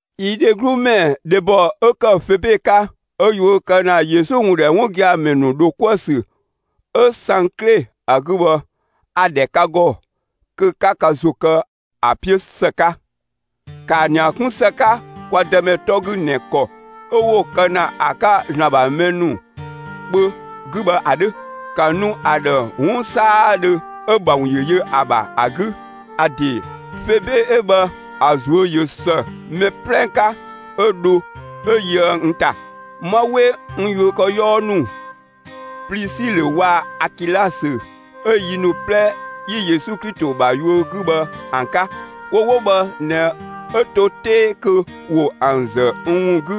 Yi dheglu ‑mɛ dhebɔ 'ö ‑kë Febe 'ka 'ö yuö kë ‑na Yesu ‑wun ‑dhɛ 'wun gia‑ ‑mɛ ‑nu ‑dho 'kuë‑ ‑sü 'ö Sankle ‑a 'gü bhë, a‑ ‑dhɛ ka ‑gɔ kö 'ka ka ‑zo kë ‑a 'piö ‑së 'ka. ‑Kaa ‑nia 'kun ‑së 'ka kwa Dëmɛ 'tɔ 'gü ꞊nɛ ‑kɔ 'ö 'wo‑ kë ‑na ‑a 'ka ‑Zlan ‑bha mɛ ‑nu kpö 'gü bhë ‑a 'dhö; ‑ka nu ‑a ‑dhë 'wun 'saadhö 'ö‑ ‑bha ‑wun ‑yö yö ‑a ‑bha ‑a 'gü. ‑A ‑de Febe 'ö bhë, ‑a ꞊zuö' ꞊yö ‑së mɛ 'plɛ 'ka 'ö dho 'ö yöë n ‑ta. 'Ma 'we n yuökëyɔɔ ‑nu Plisilö waa‑ Akilasö 'ö yi ‑nu 'plɛ 'yi Yesu Klito ‑bha yuö 'gü bhë ‑an 'ka. Wo 'wo bhë ꞊nɛ 'ö to 'tee kö ‑wo ‑an ‑zë n ‑wun 'gü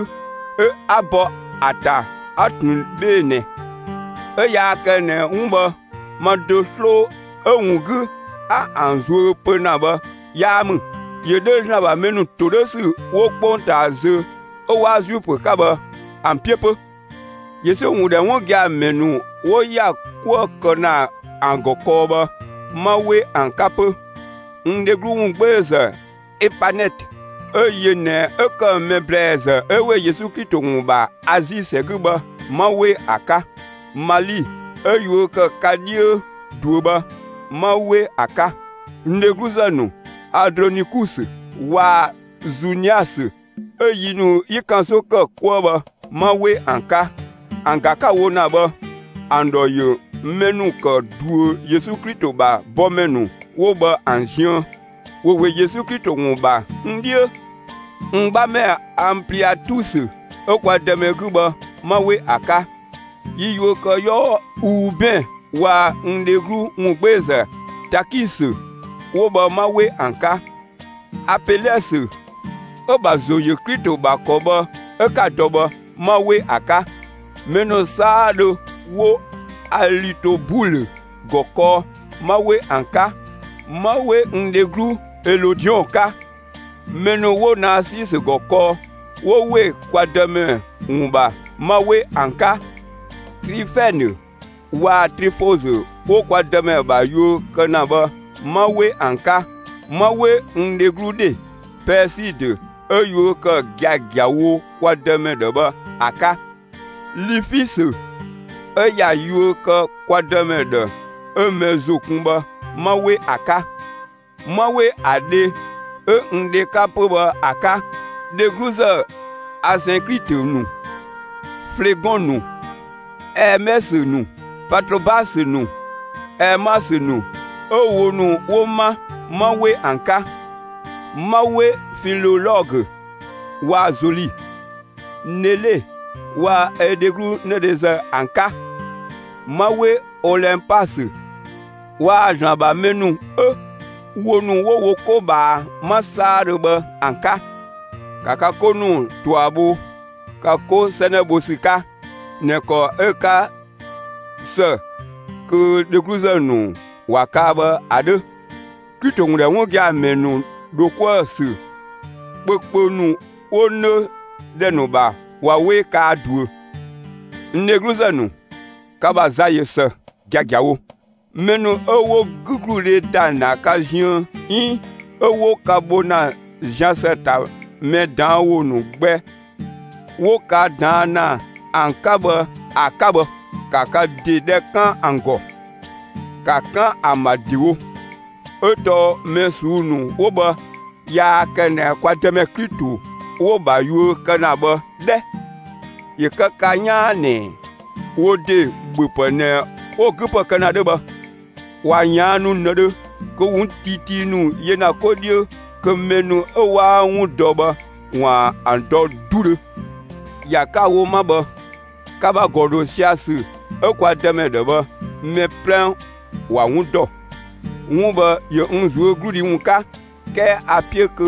'ö 'a ‑bɔ ‑a ‑ta 'a ꞊tun 'bhee‑ ꞊nɛ; 'ö yaa kë ꞊nɛ 'wun bhë ma do 'sloo, 'ö‑ ‑wun 'gü 'a ‑an zuö pö ‑na bhë 'yaa ‑mü; ‑yö 'dhö ‑Zlan ‑bha mɛ ‑nu ‑todhösü 'wo 'kpongtaa zö 'ö 'waa Zuifö 'ka bhë, ‑an 'piö 'pö. Yesu ‑wun ‑dhɛ 'wun gia‑ ‑mɛ ‑nu 'wo ‑ya 'kuë‑ kë ‑na ‑an ‑gɔ kɔɔ bhë, 'ma 'we ‑an 'ka 'pö. N dheglu ‑wungbeezë Epanɛtö, 'ö yö ꞊nɛ 'ö ‑kë mɛ ‑blɛɛzë 'ö ‑we Yesu Klito ‑wun ‑bha Azi ‑sɛ 'gü bhë, 'ma 'we ‑a 'ka. Mali 'ö yuö kë ka 'dhiö ꞊duö bhë, 'ma 'we ‑a 'ka. N dhegluzë ‑nu Andronikusö waa‑ Zuniasö 'ö yi ‑nu 'yi ‑kanso ‑kë 'kuë bhë, 'ma 'we ‑an 'ka. ‑An ‑ga 'ka‑ wo ‑na bhë, ‑an ‑dhɔ ‑yö mɛ ‑nu ‑kë ꞊duö Yesu Klito ‑bha bɔmɛ ‑nu 'wo bhë ‑an ziën. ‑Wo ‑we Yesu Klito ‑wun ‑bha n 'dhiö. N 'bhamɛ Anpliatusö 'ö kwa Dëmɛ 'gü bhë, 'ma 'we ‑a 'ka. Yi yuökëyɔɔ Uubɛn waa‑ n dheglu ‑wungbeezë Takisö, 'wo bhë 'ma 'we ‑an 'ka. Apelɛsö 'ö‑ ‑bha ‑zo yö Klito ‑bha ‑kɔ bhë 'ö 'ka‑ dɔ bhë, 'ma 'we ‑a 'ka. Mɛ ‑nu 'saadhö 'wo Alitobulö ‑gɔ kɔɔ, 'ma 'we ‑an 'ka. 'Ma 'we n dheglu Elodiɔn 'ka. Mɛ ‑nu 'wo Naasisö ‑gɔ kɔɔ, 'wo ‑we kwa Dëmɛ ‑wun ‑bha, 'ma 'we ‑an 'ka. Trifɛnë waa‑ Trifɔzö 'wo kwa Dëmɛ ‑bha yuö kë ‑na bhë, 'ma 'we ‑an 'ka; 'ma 'we n dheglu ‑dhe Pɛɛsidö 'ö yuö kë giagiawo kwa Dëmɛ ‑dhë bhë ‑a 'ka. Lifisö, 'ö ꞊ya yuö kë kwa Dëmɛ ‑dhë 'ö mɛ ‑zo kun bhë, 'ma 'we ‑a 'ka. 'Ma 'we ‑a dhe 'ö n dhe 'ka 'pö bhë ‑a 'ka. Dhegluzë Asɛnklitö ‑nu, Flegɔn ‑nu, Ɛɛmɛsö ‑nu, Patrobasö ‑nu, Ɛɛmasö ‑nu 'ö wo ‑nu 'wo 'ma, 'ma 'we ‑an 'ka. 'Ma 'we Filolɔgö waa‑ Zoli, Nele waa‑ ö dheglu 'nëdhezë ‑an 'ka; 'ma 'we Olɛnpasö waa‑ ‑Zlan ‑bha mɛ ‑nu 'ö wo ‑nu 'wo wo 'ko ꞊bhaa 'ma 'saadhö bhë ‑an 'ka. ‑Ka ka 'ko ‑nu ꞊tua bho ka 'ko 'sɛnɛ bho ‑sü 'ka ꞊nɛ ‑kɔ 'ö‑ 'ka ‑së kö dhegluzë ‑nu ‑wa kaa bhë ‑a 'dhö. Klito ‑wun ‑dhɛ 'wun gia‑ ‑mɛ ‑nu ‑dho 'kuë‑ ‑sü kpökpö ‑nu 'wo 'nö ‑dhɛ ‑nu ‑bha ꞊wa 'we kaa ꞊duö. N dhegluzë ‑nu, ka ‑bha za ꞊yö ‑së giagiawo; mɛ ‑nu 'ö 'wo 'gügludhe ‑da ‑na ka ziën 'iin 'ö 'wo ka bho ‑na zian ‑së ‑ta mɛ ꞊daan' ‑wo ‑nu gbɛ 'wo ka ꞊daan' ‑na ‑an 'ka bhë ‑a 'ka bhë, ‑ka ka ‑de dhɛ 'kan ‑an ‑gɔ! ‑Ka 'kan ‑an ‑bha ‑dewo! 'Ö tɔɔ mɛ ꞊suu'‑ ‑nu 'wo bhë, yaa kë ꞊nɛ kwa Dëmɛ Klito 'wo‑ ‑bha yuö kë ‑na bhë 'dhɛ! ‑Yö kë ka 'yaan ꞊nɛ wo ‑de ‑bhöpë ꞊nɛ 'wo‑ 'gü ‑pë kë ‑na 'dhö bhë. ꞊Wa ꞊yaannu ꞊nëdhö, kö ‑wo 'wun tiitii ‑nu yö ‑na 'ko 'dhiö kö mɛ ‑nu 'ö 'waa 'wun dɔ bhë, ‑waan ‑an dɔ 'dudhö. ‑Ya 'ka‑ wo 'ma bhë, ka ‑bha ‑gɔ ‑dho sia‑ ‑sü 'ö kwa Dëmɛ ‑dhë bhë, mɛ 'plɛ ‑wa 'wun ‑dɔ. 'Wun bhë, ‑yö n ꞊zuögludhi ‑wun 'ka; 'kɛɛ a‑ 'piö kö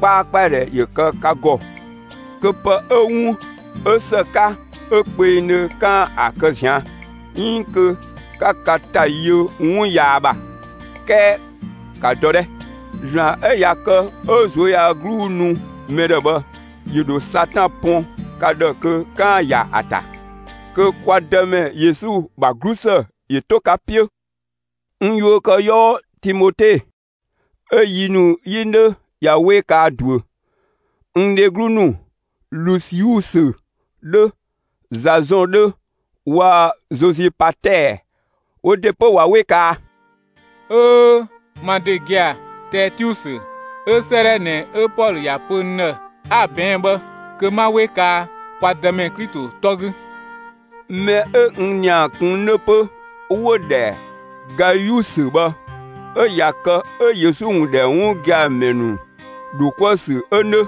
'kpaakpadhɛ ‑yö kë ka ‑gɔ, kö pë 'ö 'wun 'ö ‑së 'ka 'ö kpengdhö, 'kaan‑ ‑a kë ꞊zian', 'iin kö 'ka ka ‑ta yö 'wun yaa ‑bha. 'Kɛɛ ‑ka dɔ 'dhɛ! ‑Zlan 'ö ꞊ya kë 'ö ꞊zuöyagluu nu mɛ ‑dhë bhë, ‑yö ‑dho Satan pɔn ka ‑dhë kö 'kaan‑ ‑ya ‑a ‑ta. Kö kwa Dëmɛ Yesu ‑bha 'glusë ‑yö 'to ka 'piö! N yuökëyɔɔ Timote 'ö yi ‑nu 'yi 'nö ꞊ya 'we kaa ꞊duö. N dheglu ‑nu Lusiusö 'dhö, Zazɔn 'dhö waa‑ Zozipatɛɛ wo ‑de 'pö ꞊wa 'we kaa. Öö ma ‑de gia‑ Tɛɛtiusö 'ö 'sëëdhɛ ꞊nɛ 'ö Pɔlö ‑ya pö n ‑dhë 'a‑ ꞊bɛɛn' bhë, kö, 'ma 'we kaa (kwa Dëmɛ) Klito 'tɔ 'gü. Mɛ 'ö n ‑nia kun 'nö 'pö 'wo‑ ‑dhɛ Gayusö bhë, 'ö ꞊ya kë 'ö Yesu ‑wun ‑dhɛ 'wun gia‑ ‑mɛ ‑nu ‑dho 'kuë‑ ‑sü 'ö 'nö,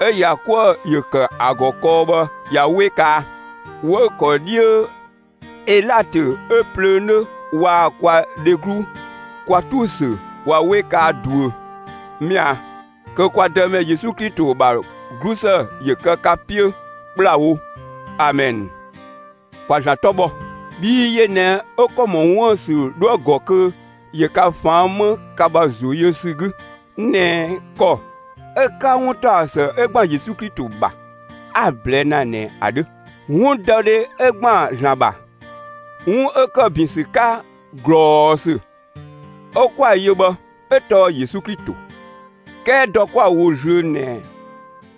'ö ‑ya 'kuë‑ ‑yö ‑kë ‑a ‑gɔ kɔɔ bhë ꞊ya 'we kaa. 'Wëü‑ ‑kɔ 'dhiö Elatö 'ö plöö 'nö waa‑ kwa dheglu Kwatusö ꞊wa 'we kaa ꞊duö. [Mɛa‑, kö kwa Dëmɛ Yesu Klito ‑bha 'glusë ‑yö kë ka 'piö ‑kplawo! Amɛn.] ‑Kwa ‑Zlan 'tɔ bhɔ, bhii yö ꞊nɛ 'ö ‑kɔ ‑mɔ 'wuën‑ ‑sü 'dhoë‑ ‑gɔ kö ‑yö ka ꞊faan' 'më ka ‑bha ‑zo yö ‑sü 'gü ꞊nɛ ‑kɔ 'ö‑ 'ka 'wuntaɔsë 'ö ‑gban Yesu Klito ‑bha 'a‑ ꞊blɛɛ' ‑na ꞊nɛ ‑a 'dhö. 'Wundɔdhe 'ö ‑gban ‑Zlan ‑bha, 'wun 'ö ‑kë ‑bin ‑sü 'ka ꞊glɔɔsü 'ö 'kwa‑ yö bhë, 'ö tɔɔ Yesu Klito. 'Kɛɛ dɔ 'kwa‑ wo zlöö ꞊nɛ,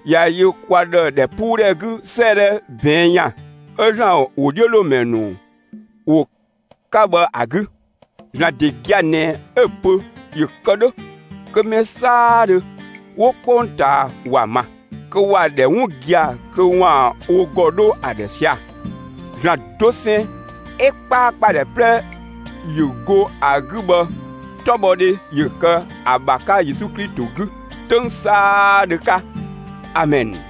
꞊ya yö kwa ‑dhë ‑dhɛpuudhɛ 'gü 'sëëdhɛ ꞊bɛɛn' ‑yan 'ö ‑Zlan ‑wodhiölomɛ ‑nu ‑wo 'ka bhë ‑a 'gü. ‑Zlan ‑de gia‑ ꞊nɛ 'ö‑ pö ‑yö kë 'dhö kö mɛ 'saadhö 'wo 'kpongtaa ‑wa ma, kö ‑wa ‑dhɛ 'wun gia‑ kö ‑waan wo ‑gɔ 'dho ‑a ‑dhë sia‑. ‑Zlan dosɛn 'ö 'kpaakpadhɛ 'plɛ ‑yö go ‑a 'gü bhë, 'tɔbhɔdhe ‑yö kë ‑a ‑bha 'ka Yesu Klito 'gü 'töng 'saadhö 'ka! Amɛn.